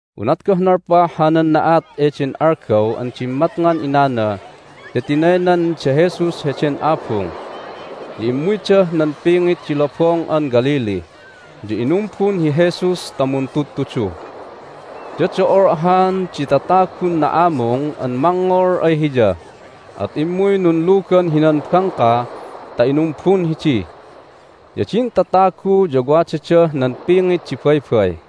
Unat goh nalpah hanan na'at eden algaw an dimmatngan inana ya tinaynan da Jesus heden abung, ya immuydah nan pingit di Lobong an Galilee, ya inumbun hi Jesus ta muntudtudu. Ya do"ol ahan di tatagun na'amung an mangngol ay Hiya, at immuy nunlugan hinan bangka ta inumbun hidi. Ya din tatagu ya wadadah nan pingit di baybay.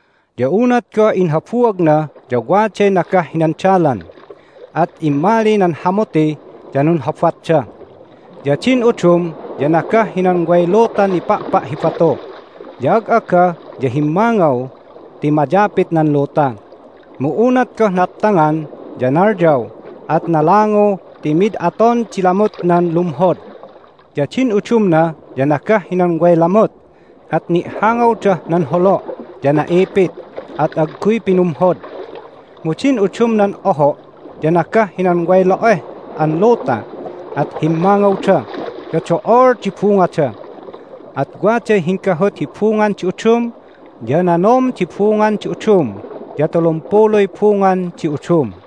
Ya unat goh inhabuagna ya waday nagah hinan dalan, at immali nan hamuti, ya nunhobatda. Ya din udum ya nagah hinan way lutan nipa'pa' hi batu, ya ag'aga ya himmangaw ti mayapit nan luta. Mu unat goh naptangan ya nalyaw, at nalangu ti mid aton di lamutnan lumhod. Ya din udumna ya nagah hinan way lamut, at ni'hangawdah nan holo', ya na'ipit, at agguy pinumhod. Mu din udumnan oho' ya nagah hinan way lo'eh an luta, at himmangawda, ya do'ol di bungada. At waday hinggahut hi bungan di udum, ya nanom di bungan di udum, ya tulumpuluy bungan di udum."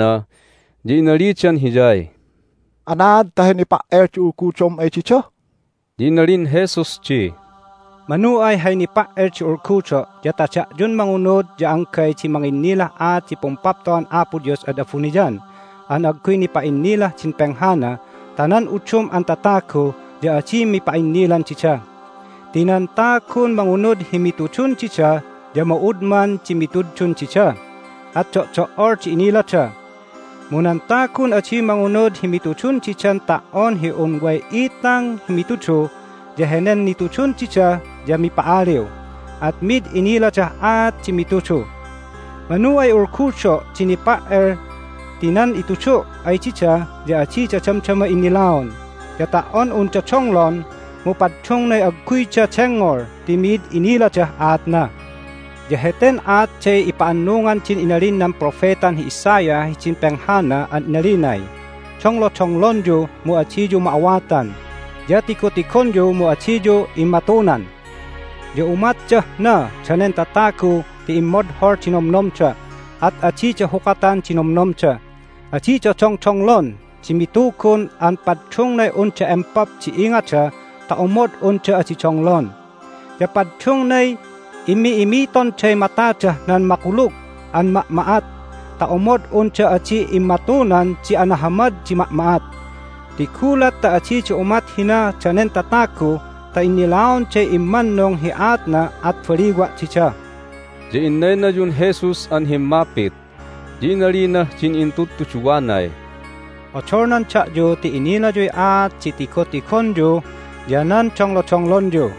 Immuy ay Jesus nan intudtuduwana, ya inalidan Hiyay, "Anaad ta hay nipa"el di ulgudom ay dida?" Ya inalin Jesus di, "Manu ay hay nipa"el di ulgudo' ya ta da'yun mangunud ya anggay di manginnilah aat di Pumpapto'an Apo Dios ad abuniyan an agguy nipa'innilah din penghana ta nan udum an tatagu ya adi mipa'innilan dida. Ti nan tagun mangunud hi mitudun dida ya ma'udman di mitudun dida, at do'do"ol di inilada. Mu nan tagun adi mangunud hi mitudun didan ta"on hi un way itang hi mitudu ya henen nitudun dida ya mipa'aliw, at mid iniladah aat di mitudu. Manu ay ulgudo' di nipa"el ti nan itudu' ay dida ya adida damdama innilaon. Ya ta"on unda donglon mu paddungnay agguyda dengngol ti mid iniladah aatna. Ya heten aatday ipa'annungan din inalin nan propetan hi Isaiah hidin penghana an inalinay, Donglodonglonyu, mu adiyu ma'awatan, ya tigotigonyu, mu adiyu immatunan. Ya umatdah na danen tatagu ti immodhol di nomnomda, at adida hukatan di nomnomda. Adida dongdonglon di mitugun an paddungnay unda empop di ingada ta omod unda adi donglon. Ya paddungnay imi'imitonday matadah nan makulug an ma'ma'at ta omod unda adi immatunan di anahamad di ma'ma'at. Ti gulat ta adida umat hina danen tatagu ta innilaonday immannung hi aatna at baliwa' dida." Ya inaynayun Jesus an himmapit, ya inalinah din intudtuduwanay, "Odolnan da'yu ti inilayuy aat di tigotigonyu ya nan donglodonglonyu!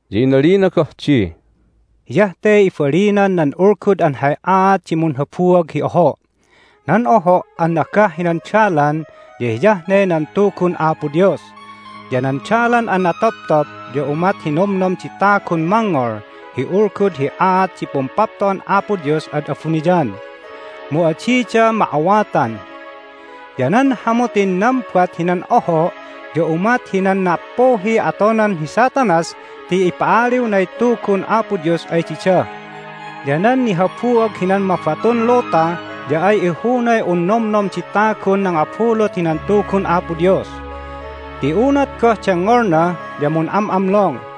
Ya inalina goh di, "Hiyah te ibalinan nan ulgud an hay aat di munhabuag hi oho': nan oho' an nagah hinan dalan ya hiyah ne nan Tugun Apo Dios. Ya nan dalan an natoptop ya umat hi nomnom di tagun mangngol hi ulgud hi aat di Pumpapto'an Apo Dios ad abuniyan, mu adida ma'awatan. Ya nan hamutin nambat hinan oho' ya umat hinan na"appuhiy atonan hi Satanas ti ipa'aliwnay Tugun Apo Dios ay dida. Ya nan nihabuag hinan mabatun luta ya ay ihunay un nomnom di tagun nangabulut hinan Tugun Apo Dios, ti unat goh dengngolna ya mun'am'amlong,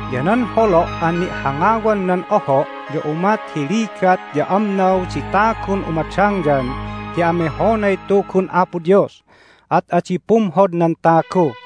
Ya nan holo' an ni'hangawan nan oho' ya umat hi ligat ya amnaw di tagun umadangyan ti amehonay Tugun Apo Dios, at adi pumhod nan tagu.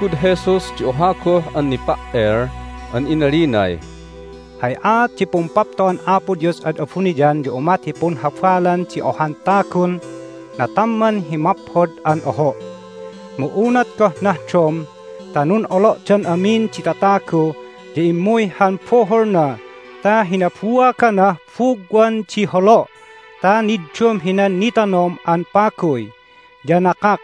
Inulgud Jesus di oha goh an nipa"el an inalinay, "Hay aat di Pumpapto'an Apo Dios ad abuniyan ya umat hi punhabalan di ohan tagun natamman hi maphod an oho'. Mu unat goh nahdom ta nun'olo'dan amin di tatagu ya immuy han buhulna ta hinabuaganah bugwan di holo' ta niddum hinan nitanom an paguy, ya nakak.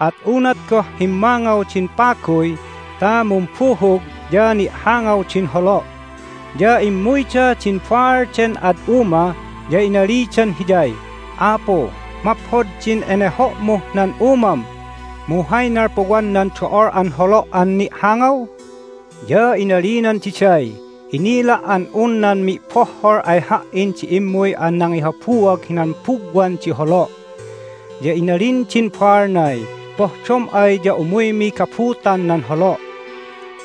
At unat goh himmangaw din paguy ta mumbuhug ya ni'hangaw din holo'. Ya immuyda din baal den ad uma, ya inalidan hiyay, Apu, maphod din eneho'muh nan umam, mu hay nalpuwan nan do'ol an holo' an ni'hangaw? Ya inalinan diday, Inila' an un nan mi'bohhol ay ha"in di immuy an nangihabuag hinan bugwan di holo'! Ya inalin din baalnay, Pohdom ay ya umuymi gabutan nan holo'.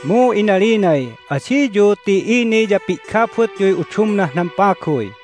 Mu inalinay, Adiyu ti ini ya pi'gabutyuy udumnah nan paguy!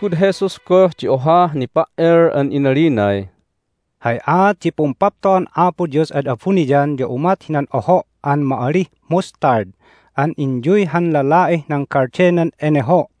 Inulgud Jesus goh di ohah nipa"el an inalinay, "Hay aat di Pumpapto'an Apo Dios ad abuniyan ya umat hinan oho' an ma'alih mustard an inyuy han lala'ih nan galdenan eneho'.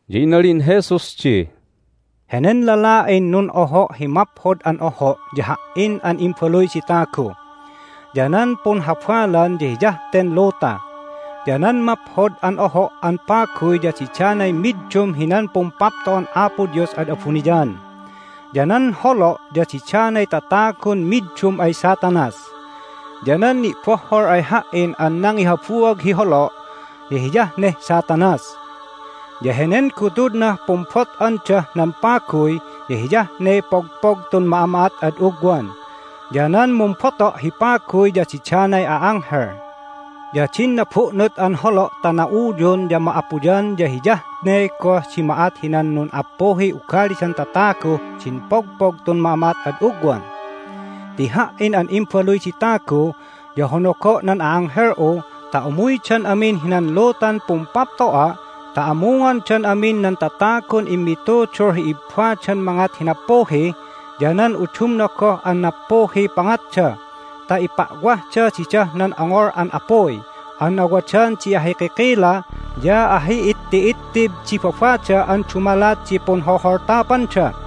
Ya inalin Jesus di, "Henen lala'in nun'oho' hi maphod an oho' ya Ha"in an Imbaluy di Tagu. Ya nan punhabalan ya hiyah ten luta, ya nan maphod an oho' an paguy ya didanay middum hinan Pumpapto'an Apo Dios ad abuniyan. Ya nan holo' ya didanay tatagun middum ay Satanas. Ya nan ni'bohhol ay Ha"in an nangihabuag hi holo' ya hiyah neh Satanas. Ya henen gutudnah pumbot'andah nan paguy ya hiyah ne pogpog tun ma'ama'at ad ugwan. Ya nan mumboto' hi paguy ya didanay a'anghel. Ya din nabu'nut an holo' ta na'uyun ya ma'apuyan ya hiyah ne goh di ma'at hinan nun'appuhiy ugalidan tataguh din pogpog tun ma'ama'at ad ugwan. Ti Ha"in an Imbaluy di Tagu ya honogo' nan a'anghel'u ta umuydan amin hinan lutan Pumpapto'a' ta amungondan amin nan tatagun immitudul hi ibbadan mangat hi nappuhi ya nan udumna goh an nappuhiy pangatda ta ipa'wahda didah nan ongol an apuy an awadan di ahikikila ya ahi'itti'ittib di babada an dumalat hi punholholtapanda.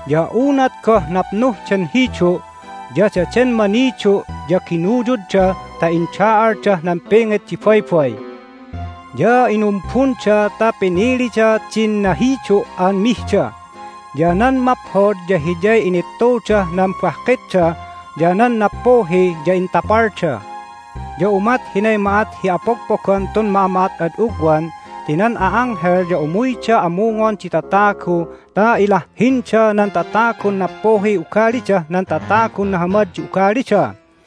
Ya unat goh napnuh den hidu' ya daden manidu' ya ginuyudda ta inda'aldah nan pingit di baybay. Ya inumbunda ta pinilida din nahidu' an mihda. Ya nan maphod ya hiyay inittudah nan bahkitda, ya nan nappuhi ya intapalda. Ya umat hinay ma'at hi apogpogan tun ma'ama'at ad ugwan ti nan a'anghel ya umuyda amungon di tatagu ta ilahhinda nan tatagun nappuhiy ugalidah nan tatagun nahamad di ugalida.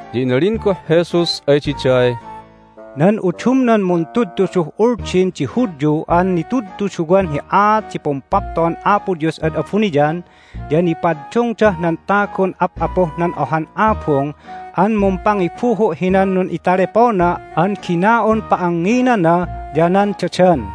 Ya inalin goh Jesus ay diday, "Nan udumnan muntudtuduh Uldin di Hudyu an nitudtuduwan hi aat di Pumpapto'an Apo Dios ad abuniyan ya nipaddungdah nan tagun ap'apuh nan ohan abung an mumpangibuhu' hinan nun'italepona an gina'un pa'angnginana ya nan dadan."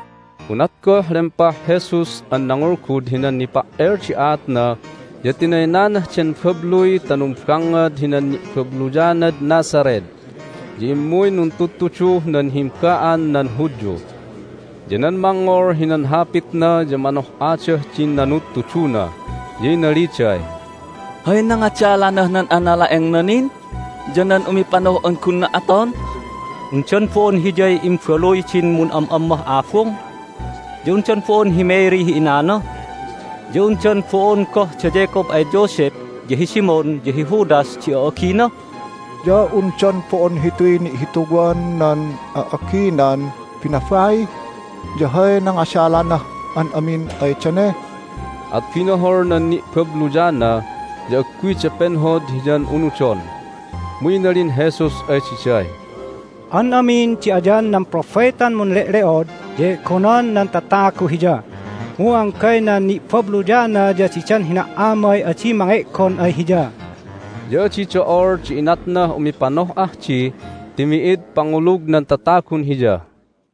Unat goh lempah Jesus an nangulgud hinan nipa"el di aatna ya tinaynanah den babluy ta numbangngad hinan ni'babluyanad Nazareth. Ya immuy nuntudtuduh nan himba'an nan Hudyu. Ya nan mangngol hinan hapitna ya manoh'adah din nanudtuduna, ya inaliday, "Hay nangadalanah nan anala'engna nin ya nan umipanoh'an gunna aton? Undan bo'on Hiyay imbaluy din mun'am'ammah abung? Ya undan bo'on hi Mary hi inana? Ya undan bo'on goh da Jacob ay Joseph, ya hi Simon, ya hi Judas di a'agina? Ya undan bo'on hituy ni'hituwan nan a'aginan binabai? Ya hay nangadalanah an amin ay dane?" At binohol nan ni'babluyana, ya agguyda penhod Hiyan unudon. Mu inalin Jesus ay diday, "An amin di ayan nan propetan munle'le'od ya e'gonan nan tatagu hiya, mu anggay nan ni'babluyana ya didan hina"amay adi mange'gon ay hiya." Ya adi do'ol di inatnah umipanoh'ah di ti mi'id pangulug nan tatagun Hiya.